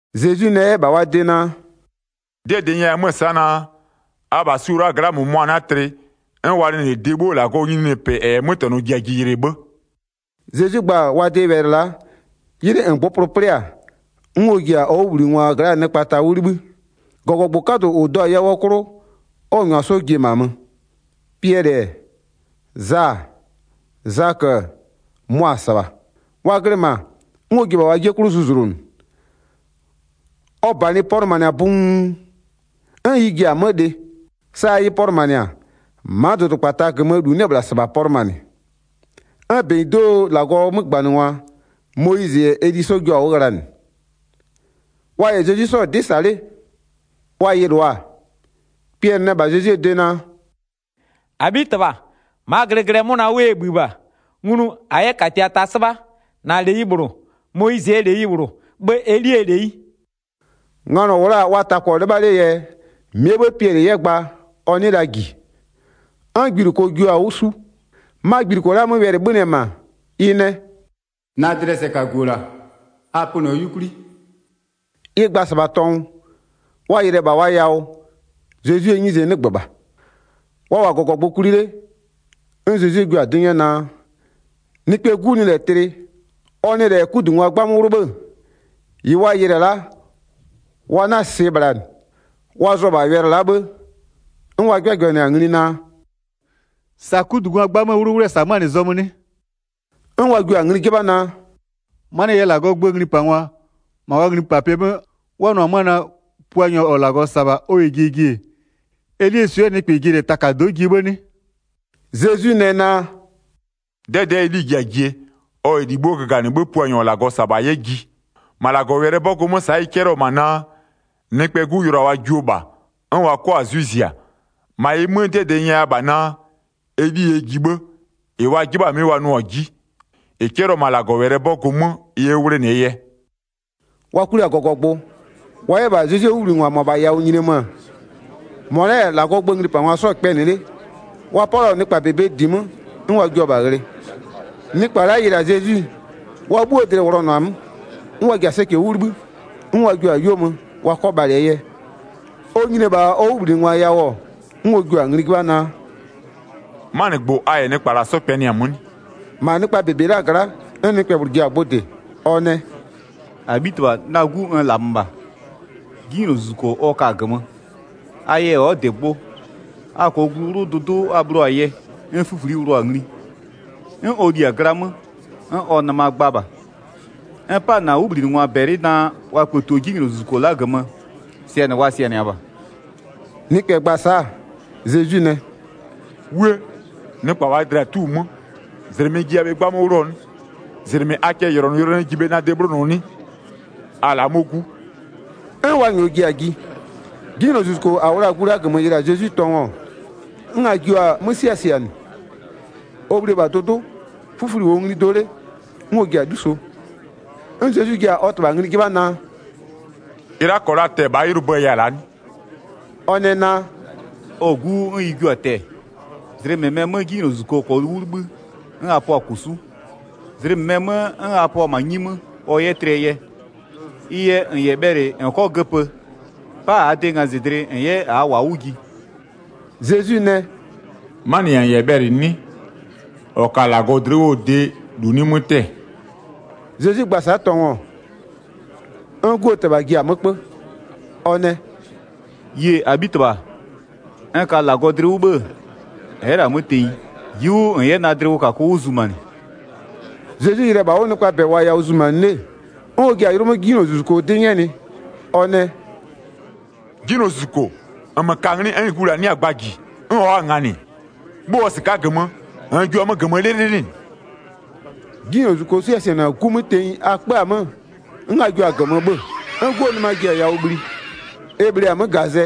Zezwi nɛ 'yɛ -bha wa de naa: “'Dɩɛ -dɩ n nyɛya 'mö-ö sa'a naa: Abha su-o la'a gla'aa nɩkpa -mʋmʋa 'na tlɩ, 'n wa nɩ -lɛ de 'bhuo -Lagɔɔ nyininyinipɩ -ɛ -yɛ 'mötɛnɔ ji-a jie yɩlɩ 'bhë.” Zezwi gba-a wa de wɛlɩ la'a, 'ylɩ -ngbʋpʋlʋ 'plɩ-a, 'n ɔ ji-a ɔ 'wʋbhlinɩngwa gla'aa nɩkpa ta 'wʋ 'libhï, -gɔgɔgbʋ 'kadʋ -ʋ 'do-a yawʋɔ 'klʋ, 'n ɔ -nyʋa 'sɔ ji-e -ma mö. Piɛlɩ-ɛ, Za-a, Zakö-ö, mʋa-a -sɩbha. Wa glɩ -ma, 'n ɔ ji-e -bha wa 'jie 'klʋ zuzlonʋ. Ɔ -banɩ pɔlʋmanɩ-a buun, 'n ɩ ji-a 'mö lɩ, sa ɩ pɔlʋmanɩ-a ma'a dʋdʋkpata -gömöö -lu 'nɩ-ɛ -bhla -sɩbha pɔlʋmanɩ. 'N -benyido'oo -Lagɔɔ 'mögbanɩngwa, Moyizɩ -yɛ Eli 'sɔ jua-a 'wʋ ghlanɩ. Wa -yɛ Zezwi 'sɔ-ɔ 'dɩ -sa 'le. Wa yɩlʋa-a, Piɛlɩ nɛ -bha Zezwie de naa: “-Abhitɩbha, ma'aa glɩglɩɛ 'mʋna 'wʋ ɛ -bhï -bha, nglu -a 'yɛ -katia ta 'sɩbha, -na -leyi -bhlʋ, Moyizɩɛ -leyi -bhlʋ, 'bhë Elie -leyi.” Nganɔ -wʋ la-a wa ta -kpɔ 'lɩbha 'lee yɛ, -mɩɛ 'bhë Piɛlɩ 'yɛ gba ɔ 'nɩɩ la -ji. 'N gbiluko jua-a 'wʋ 'su, -ma gbiluko la'a 'mö wɛlɩ 'bhönɩ-ɛ -ma ɩ nɛ: “Na dlɩɛ sɛkagu-o -la, a pönɩɔ 'yukwli.” Ɩ gba-a -sɩbha tɔngʋ, wa yɩlɩ-ɛ -bha wa yawʋ, Zezwie 'nyize 'nɩgbö -bha. Wa -wʋ-a -gɔgɔgbʋ kwli 'le, 'n Zezwi jua-a 'dɩ 'nyɛ naa, Nɩkpɛɛ 'Gu nɩ -lɛ tlɩ, ɔ nɩ -lɛ 'kudungwa 'gbamö 'wlʋ 'bhë-ë, -ɩ wa yɩlɩ-ɛ la'a wa 'na-a -sɩɩ -bhla -nɩ. Wa zʋ-ɔ -bha wɛlɩ la'a 'bhë, 'n wa 'jɩbhajɩbhanɩ-a ngli naa: “Sa 'kudungwa 'gbamöö 'wlʋwlʋɛ -sa 'mö-a -nɩ zɔmö 'nɩ?” 'N wa jio-a ngli 'jɩbha naa: “'Manɩɛ yɛ -Lagɔɔ gböö nglipangwa, -ma wa nglipapɩɛ 'mö, 'n wa nʋ-ɔ 'mö-ö naa: Puanyɔ -ɔ -Lagɔ -sa-a -bha ɔ -yɛ jie ji-e, Elie swɩɛ nɩkpɛ ji-a -lɛ takado'o jie 'bhë 'nɩ?” Zezwi nɛ naa: “'Dɛdɛ'ɛ Eli-i ji-a jie, ɔ -yɛ -li 'bhuo göganɩ 'bhë Puanyɔ -ɔ -Lagɔ -sa-a -bha 'yɛ ji. -Ma -Lagɔwɛlɩɛ 'bɔgʋ 'mö, sa'a ɩ 'cɛlɩɔ-ɔ -ma naa, Nɩkpɛɛ 'Gu yʋlʋa wa jio -bha, 'n wa 'kɔ-a 'zwɩ zia. 13-Ma ɩ 'mö, 'dɩɛ -dɩ n nyɛya -bha naa: Eli yɛ ji 'bhë, -ɩ wa 'jɩbha-a 'mɩ wa nʋɔ-a 'ji, -ɩ 'cɛlɩɔ-ɔ -ma -Lagɔwɛlɩɛ 'bɔgʋ 'mö, ɩ 'yɛ 'wʋ 'wlenɩɛ yɛ.” Wa kwli-a -gɔgɔgbʋ, wa 'yɛ -bha Zezwie 'wʋbhlinɩngwa -mʋabhaa yawʋ nyinie mö-ö, -mʋa la'a -yɛ -Lagɔɔ gböö nglipangwa 'sɔ-ɔ kpɛnɩ 'le, wa 'palɩɔ nɩkpa -bebee -di 'mö, 'n wa jua-a -bha ghlɩ. Nɩkpa la'a yɩlɩ-a Zezwi-e, wa 'bhuo dlɩ-ɩ wʋlɔnʋa-a 'mö, 'n wa ji-a sɛcɛ 'wʋ 'libhï, 'n wa jio-a 'yuo mö wa 'kɔ bhalɩɛ yɛ. Ɔ nyini-e -bha ɔ 'wʋbhlinɩngwa yawʋ-ɔ, 'n ɔ jua-a ngli 'jɩbha naa: “'Manɩgbʋ a -yɛ nɩkpa -la 'sɔ kpɛnɩ-a 'mö 'nɩ?” 17-Ma nɩkpa -bebe la'aa gla'a, 'n nɩkpɛ -bhlʋ ji-a gbʋ -dɩ, ɔ nɛ: “-Abhitɩbha, na 'gu n -lamö -bha, 'jinylozuzuko ɔ ka-a -gömö, a yɛ ɔ'ɔ -dɩ gbʋ. A -kɔɔ glu 'wlʋ, dʋdʋ'ʋ a bhlɩɔ-a yɛ, 'n 'fïfli'i 'wlʋɔ-a ngli, 'n ɔ li-a gla 'mö, 'n ɔ nɩma gba -bha. N 'pa-a -na 'wʋbhlinɩngwa -bɛlɩ naa, wa kpëtio 'jinylozuzuko la'a -gömö, sɩanɩ wa sɩanɩa -bha.” Nɩkpɛ gba-a sa'a, Zezwi nɛ: “'Wuë! Nɩkpa -waa dlɩa-a 'tu-u 'mö, -zlɩmɩ n jiya-a 'gba 'mö 'wlʋɔ 'nɩ? -Zlɩmɩ a cɛyʋlɔnʋyʋlɔnʋɛ ji bhe na de 'bhlonʋɔ 'nɩ? A la'a 'mɔ 'gu.” 'N wa -nyɔɔ ji-a ji. 'Jinylozuzuko -a -wʋ la-a gu la'a -gömö yɩlɩ-a Zezwi tɔngʋ, 'n a jio-a 'mö 'siasianɩ. Ɔ bhli-e -bha dʋdʋ'ʋ, 'fïfli'i -wʋɔ ngli do 'le, 'n ɔ ji-a 'luso. 'N Zezwi ji-a ɔ -tɩbha ngli 'jɩbha naa: “-Ɩ la'a -kɔɔ la tɛ-ɛ -bhaa 'ylʋbö ya-a la'a 'nɩ?” Ɔ nɛ naa:“ Ɔ-ɔ 'gu 'wʋ 'n ɩ jio-a tɛ-ɛ. Zlɩ -mɩmɛɛ 'mö 'jinylozuzuko -kɔɔ 'wʋ 'libhï, 'n a pɔ-a -kosu'u. Zlɩ -mɩmɛɛ 'mö, 'n a pɔ-a 'nyi 'mö ɔ 'yɛ tlɩɛ yɛ. Ɩ yɛ -n -yɛ bhɛlɩ -n 'kɔ göpö, 'pa -aa de ngazɩdlɩ -n 'yɛ -aa -wa 'wʋ ji.” Zezwi nɛ: “'Manɩ -yɛ-a -n -yɛ bhɛlɩ 'nɩ? -Ɔ ka-a -Lagɔ dlɩ 'wʋɔ de -lu 'nɩ 'mö 'tɛ-ɛ.” Zezwi gba-a sa'a tɔngʋ, 'n 'guo -tɩbha ji-a 'mö 'kpö ɔ nɛ: “Yie-e! -Abhitɩbha, n ka -Lagɔ dlɩ 'wʋ 'bhë-ë, ɛ'ɛ -lɛ-a 'mö tenyi, ji'i 'wʋ -n 'yɛ na dlɩwʋkakʋ 'wʋ zumanɩ.” Zezwi yɩlɩ-ɛ -bha 'wʋ nɩkpaa -bɛ -wʋɔ-a yawʋ zumanɩ 'le, 'n ɔ ji-a yʋlʋ 'mö 'jinylozuzuko 'dɩ 'nyɛnɩ, ɔ nɛ: “'Jinylozuzuko, -nmö ka-a 'nglɩ 'n gu -la 'nɩ-a gbaa -ji, 'n ɔ'ɔ-a -nganɩ, 'bhö-öɔ -sɩka'a -gömö, -nn jio-a 'mö -gömö 'lɩlɩlɩ -nɩ.” 'Jinylozuzuko 'siasianɩ-a 'gu 'mö tenyi, a 'kpö-a 'mö, 'n a jio-a -gömö 'bhö-ö. 'N 'guo nɩma ji-a yawʋ bhli e -bhlee-a 'mö -gazɛ,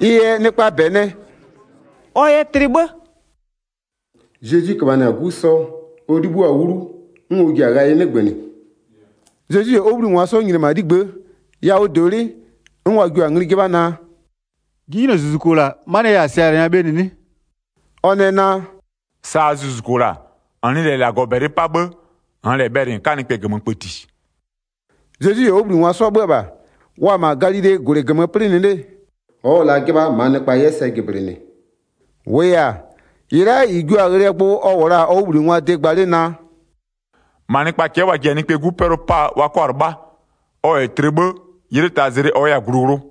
ɩ yɛ nɩkpaa -bɛ nɛ: “Ɔ yɛ tlɩ 'bhë!” Zezwi köbhanɩ-a 'gu sɔ, ɔ 'libhïo-a 'wlu, 'n ɔ ji-a ghayɩ 'nɩgbönɩ. Zezwi -yɛ ɔ 'wʋbhlinɩngwa 'sɔ nyini-e -ma 'ligbë'ë, yawʋdolɩ'ɩ, 'n wa jio-a ngli 'jɩbha naa: “'Jinylozuzuko -la, 'manɩɛ yɛ -a sɩanɩa bhe -nɩ 'nɩ?” Ɔ nɛ naa: “-Saa zuzuko -la, -n nɩ -lɛ -Lagɔ -bɛlɩ 'pa 'bhë, -nn -lɛ bhɛlɩ -n 'ka nɩkpɛ -gömö kpëti.” Zezwi -yɛ ɔ 'wʋbhlinɩngwa 'sɔ 'bhö-ö -bha, wa-a -ma Galilee -gwlɩ -gömö 'plɩnɩ 'le-e, ɔ'ɔ la 'jɩbha -maa nɩkpa 'yɛ sɛ jɩblɩnɩ. 31-Wʋʋ yɛ-a, -ɩ la'a -ɩ jio-a ghlɩɛ gbʋ ɔ -wʋ la-a ɔ 'wʋbhlinɩngwaa de gba 'le naa: “-Ma nɩkpaa cɛ'ɛ wa ji-a Nɩkpɛɛ 'Gu 'pɛlʋ 'paa, wa 'kɔ-a 'lɩbha. Ɔ -yɛ tlɩ 'bhë, 'ylɩ taa zlɩ ɔ 'yɛ-a glu 'wlʋ.”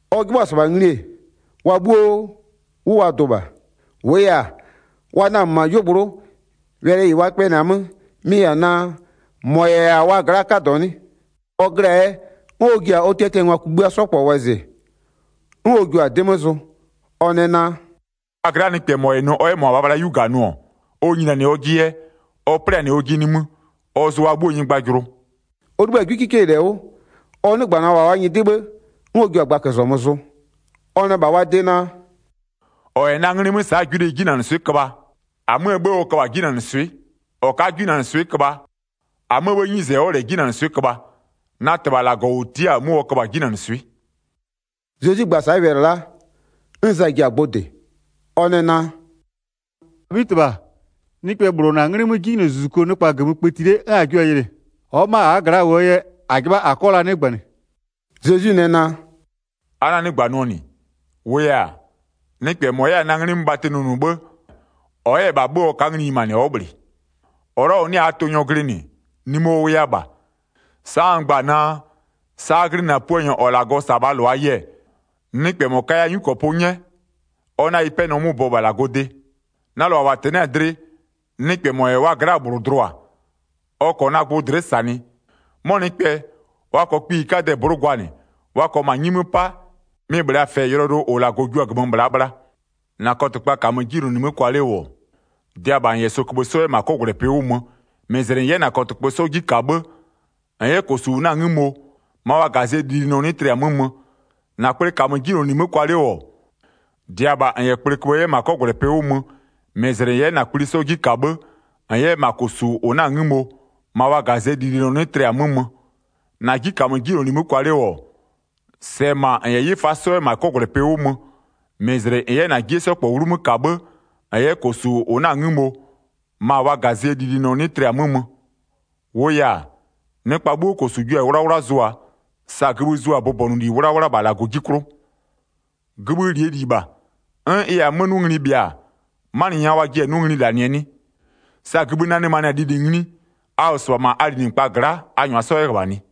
Ɔ 'jɩbhʋa-a -sɩbha ngli-e, wa 'bhuo 'wʋ wa dʋ -bha, -wʋʋ yɛ-a, wa namö-ö -ma 'yuogblʋ'ʋ, wɛlɩ -ɩ wa kpɛnɩ-a 'mö mɩ-ɩ -yɛ-a naa, -mɔ -yɛ-a wa gla'aa 'kadɔ 'nɩ? Ɔ glɩ-a yɛ, 'n ɔ ji-a ɔ tiatiangwa kugbïa 'sɔ -kpɔ wɔzɩ, 'n ɔ jua-a 'dɩ 'mö zʋ, ɔ nɛ naa: “A gla'aa nɩkpɛ -mɔ -yɛ nʋ ɔ 'yɛ -mʋabhaa bhla 'yu -ga nʋ-ɔ, ɔ nyini-a ɔjɩ yɛ, ɔ 'plɩanɩ ɔjɩ nimï, ɔ zʋ a 'bhuoo nyɩgbajʋlʋ.” Ɔ 'libhï-a 'gwikikeyi -lɛ 'wʋ, ɔ 'nɩgbanɩɔ-ɔ -bha wa nyɩdɩ 'bhë, 'n ɔ jio-a gbaközɔmö zʋ. Ɔ nɛ -bha wa de naa: “-Ɔ -yɛ na 'nglɩ 'mö sa'aa 'gwileyi 'jinanɩswɩ'ɩ köbha, -amöö 'bhë ɔ köbha-a 'jinanɩswɩ'ɩ, -ɔ ka'a 'yɛ 'jinanɩswɩ'ɩ köbha -amöö 'bhëë 'nyize ɔ'ɔ -lɛ 'jinanɩswɩ'ɩ köbha, na -Tɩbha -Lagɔ -ʋ tia'a-a 'mʋ ɔ köbha-a 'jinanɩswɩ'ɩ.” Zezwi gba-a sa'a wɛlɩ la'a, 'n Za ji-a gbʋ -dɩ, ɔ nɛ naa: “-Abhitɩbha, nɩkpɛ -bhlʋ-ɔ -na 'nglɩ 'mö 'jinylozuzuku nɩkpa -gömö kpëti 'le 'n -a jio-a yɩlɩ. Ɔ'ɔ ma'a -aa gla'a -wʋɔ yɛ, -a 'jɩbha -a 'kɔ la 'nɩgbanɩ.” Zezwi nɛ naa: “A 'na-a 'nɩgbanɩɔ -nɩ, -wʋʋ yɛ-a, nɩkpɛ -mɔ 'yɛ-a na 'nglɩ 'mö bhatɩ nʋnʋ 'bhë, ɔ 'yɛ -bha 'bhö-ö ɔ ka'a ngli nyimanɩ ɔ'ɔ -bhlɩ. 40-Ɔ la'a -ɔ 'nɩ-a -aa tʋnyɔ glɩnɩ-ɛ, nimï ɔ -wʋya -bha. Sa'a n gba-a naa, sa a glɩnɩ-a Puanyɔ -ɔ -Lagɔ -sa-a -bhaa -lʋaa yɛ, nɩkpɛ -mɔ kaya 'nyukɔpʋ 'nyɛ, ɔ 'na ɩ 'pɛnɔ 'mö bɔ -bha -Lagɔɔ de. Na -lʋa -wa -tɛnɩ'ɩ-a dlɩ, nɩkpɛ -mɔ -yɛ wa gla'aa -bhlʋ dlʋa, ɔ -kɔɔ na gbʋ dlɩ'ɩ -sanɩ, 'mɔ nɩkpɛ, wa -kɔɔ kpiyikadɛ -blʋ'ʋ gwanɩ, wa -kɔɔ -ma gïnyi 'mö 'pa, mɩ-ɩ -bhlee-a -fɛ yʋlɔyʋlʋ -ʋ -Lagɔ jio-a -gömö -laa bhla. 43-44-Na kɔtɩkpa -kamö 'jinyloli 'mö kwa 'le -wʋ-ɔ, -dɩa -bha -n -yɛ sɔköbhë 'sɔ 'yɛ -ma 'kɔgwlɛpɩ 'wʋ mö, -mɩzlɩ -n 'yɛ -na kɔtɩkpö 'sɔ 'ji -ka 'bhë, [-n 'yɛ -kosu -ʋ 'na-a 'ngïmo, ma wa -gazɩɛ lilinɔ 'nɩ tlɩ-a 'mö mö.] 45-46-Na kple -kamö 'jinyloli 'mö kwa 'le -wʋ, -dɩa -bha -n -yɛ kpleköbhë 'yɛ -ma 'kɔgwlɛpɩ 'wʋ mö, -mɩzlɩ -n 'yɛ -na kpli 'sɔ 'ji -ka 'bhë, [-n 'yɛ -ma -kosu -ʋ 'na-a 'ngïmo, ma wa -gazɩɛ lilinɔ 'nɩ tlɩ-a 'mö mö.] 47-48-Na 'ji -kamö 'jinyloli 'mö kwa 'le -wʋ-ɔ, -sɛɛ -ma -n -yɛ 'yɩfa 'yɛ -ma 'kɔgwlɛpɩ 'wʋ mö, -mɩzlɩ -n 'yɛ -na 'jie 'sɔ -kpɔ 'wlumö -ka 'bhë, -n 'yɛ -ma -kosu -ʋ 'na-a 'ngïmo, ma wa -gazɩɛ lilinɔ 'nɩ tlɩ-a 'mö mö. 49-Wʋʋ yɛ-a, nɩkpa 'bhuo -kosu jua-a 'wlawla zʋa-a, sa gïbhï zʋa-a bʋbɔnʋli 'wlawla -bha -Lagɔ 'ji 'klʋ. 50Gïbhï -lie -li -bha, 'n ɩ -yɛ-a 'mö 'nʋ ngli bhɩa-a, 'manɩ nya a jiɩ-e 'mö-a 'nʋ ngli -lanɩɛ 'nɩ? 51Sa gïbhï nanɩmanɩ-a lili ngli a -wʋ -sɩbha -ma a linɩkpa gla'a, a -nyʋa 'yɛ -ghöbhanɩ.”